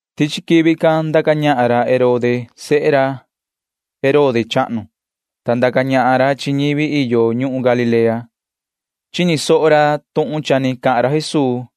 Tichi quivi can ndaca ñahan ra Herode sehe ra Herode chahnu, [ta ndaca ñahan ra chi ñivi iyo ñuhun Galilea]. Chini soho ra tuhun cha ni savaha ra Jesuu,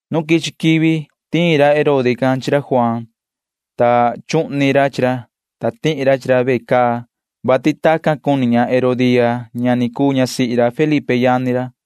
[Nu quichi quivi] cha tiin ra Herode can chi ra Juaan, ta chuhni ra chi ra, ta tihi ra chi ra ve caa, vati tacan cuni ña Herodía ña cha ni cuu ñasihi ra Felipe yani ra.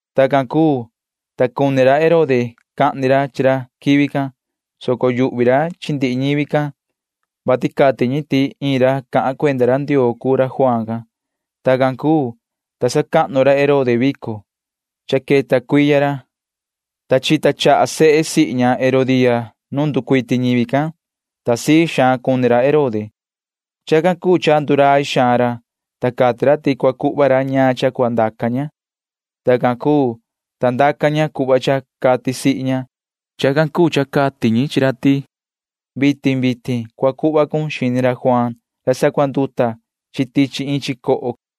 Tacan cuu, ta cuni ra Herode cahni ra chi ra quivi can, soco yuhvi ra chi ndihi ñivi can, vati cati ñi ti iin ra cahan cuenda ra Ndioo cuu ra Juaan can. Tacan cuu, ta sacahnu ra Herode vico, vati cha queta cuiya ra, ta chita chaha se sihi ña Herodía nu nducuiti ñivi can, ta sii xaan cuni ra Herode. Chacan cuu cha ndurai xaan ra, ta cati ra ti cua cuhva ra ñaan cha cua ndaca maan ña. Tacan cuu, ta ndaca ña cuhva cha cati sihi ña. Chacan cuu cha cati ñi chi ra ti: ―Vitin vitin cua cuhva cun xini ra Juaan ra sacuanduta tichi iin chicoho ―cati ña.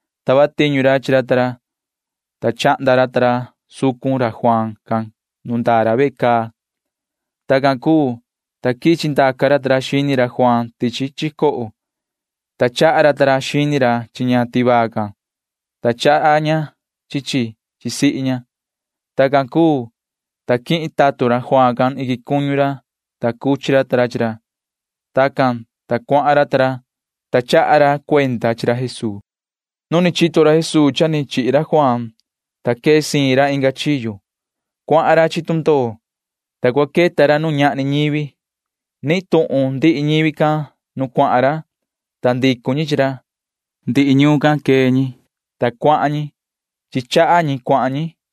Tava tiñu ra chi ra ta ra, ta chahnda ra ta ra sucun ra Juaan can nu ndaa ra ve caa. Tacan cuu, ta quichi ndaca ra ta ra xini ra Juaan tichi chicoho, ta chaha ra ta ra xini ra chi ña tivaa can, ta chaha ña chi chi chi sihi ña. Tacan cuu, ta quihin ra tatun ra Juaan can iquin cuñu ra, ta cuchi ra ta ra chi ra. Tacan, ta cuahan ra ta ra, ta chaha ra cuenda chi ra Jesuu. Chini ra Jesuu tuhun cha ni chihi ra Juaan can, ta quee siin ra tican. Cuahan ra chi tundoo, ta cua queta ra nu ñahni ñivi. Nihin tuhun ndihi ñivi can nu cuahan ra, ta ndicu ñi chi ra. Ndihi ñuun can quee ñi, ta cuahan ñi. Chi chaha ñi cuahan ñi nu ñuhun.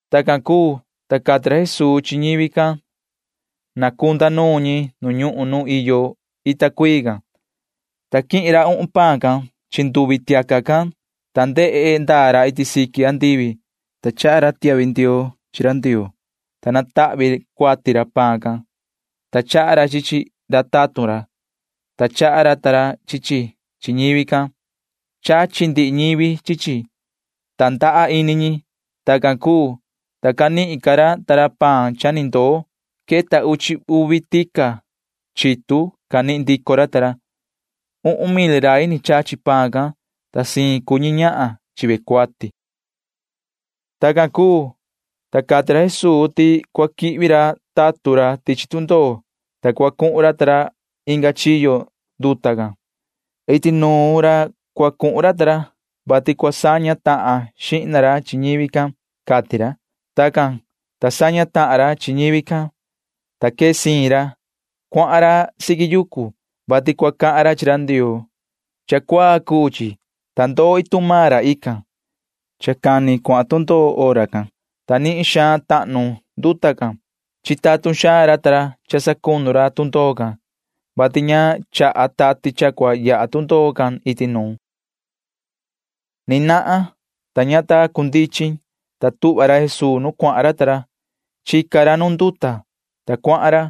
Tacan cuu, ta cati tuhun ra Jesuu ti cua cunda ñivi can nu ñuhun nu iyo ita cuii can, ta quihin ra uhun paan can chi nduvi tiaca can, ta ndehe ndaa ra iti siqui andivi, ta chaha ra iin tiahvi ndioo chi ra Ndioo, ta natahvi cuati ra paan can, ta chaha ra chi chi chi ra tatun ra, ta chaha maan ra ta ra chi chi chi ñivi can. Chachi ndihi ñi chi chi, ta ndaha ini ñi. Tacan cuu, ta canihin ra ta ra chehe paan cha ni ndoo. Queta uchi uvi tica chitu chehle canihin ndico ra ta ra. Vasi queta uhun mil rai ni chachi paan can, ta siin cuu ñi ñahan chi ve cuati. Tacan cuu, ta cati ra Jesuu ti cua quihvi ra tatun ra tichi tundoo, ta cua cuhun ra ta ra inga chiyo nduta can. Iti nuun ra cua cuhun ra ta ra, vati cua saña tahan xihna ra chi ñivi can, cati ra. Tacan, ta saña tahan ra chi ñivi can, ta quee siin ra. Cuahan ra siqui yucu, vati cua cahan ra chi ra Ndioo. Cha cuaa cuu chi, ta ndoo iin tuhun maan ra ican. Cani vihi cha cuahan tundoo hora can, ta nihin suhva tahnu nduta nuun chi. Chitatun xaan ra ta ra cha sacunu ra chi tundoo can, vati ña chaha tati can cha cua yaha tundoo can iti nuun. Ni nahan vihi, [ta ña ta cundichin,] ta tuhva ra Jesuu nu cuahan ra ta ra. Chica ra nu nduta, ta cuahan ra.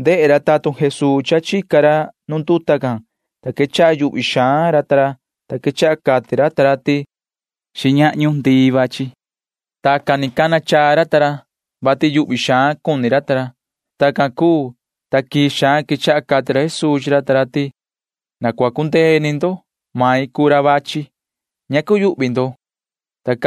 Ndehe ra tatun Jesuu ti cha chica ra nu nduta can, ta quechaha cuyuhvi xaan ra ta ra, ta quechaha cati ra ta ra ti: ―Xiñahñu ndii vachi. Tacan ni cana chaa ra ta ra, vati yuhvi xaan cuni ra ta ra. Tacan cuu, ta quii xaan quechaha cati ra Jesuu chi ra ta ra ti: ―Na cua cundee ini ndo. Main cuu ra vachi. Ña cua cuyuhvi ndo ―cati ra.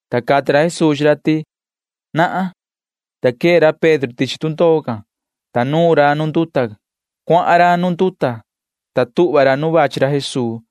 Ta cati ra Jesuu chi ra ti: ―Nahan. Ta quee ra Pedro tichi tundoo can, ta nuun ra nu nduta. Cuahan ra nu nduta, ta tuhva ra nu vachi ra Jesuu,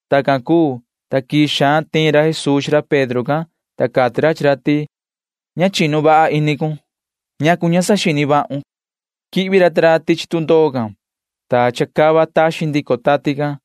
Tacan cuu, ta quii xaan tiin ra Jesuu chi ra Pedro can, ta cati ra chi ra ti: ―Ña chinu vaha ini cun. ¿Ñacu ña saxini vahun? ―cati ra. Quihvi ra ta ra tichi tundoo can, ta chacava taxin ndico tati can,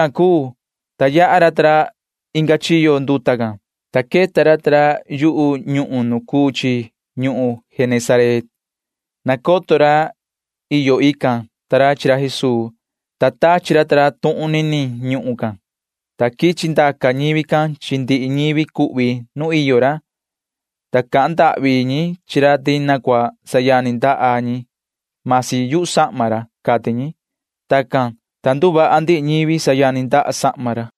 Tacan cuu, ta yaha ra ta ra inga chiyo nduta can, ta queta ra ta ra yu ñuhun nu cuu chi ñuhun Genesaret. Nacoto ra iyo ican ta ra chi ra Jesuu, ta tachi ra ta ra tuhun niniin ñuhun can, ta quichi ndaca ñivi can chi ndihi ñivi cuhvi can nu iyo ra, ta cahan ndahvi ñi chi ra ti na cua sayani ndaha ñi―masi yu sahma ra, cati ñi. Tacan, ta nduvaha ndihi ñivi sayani ndaha sahma ra.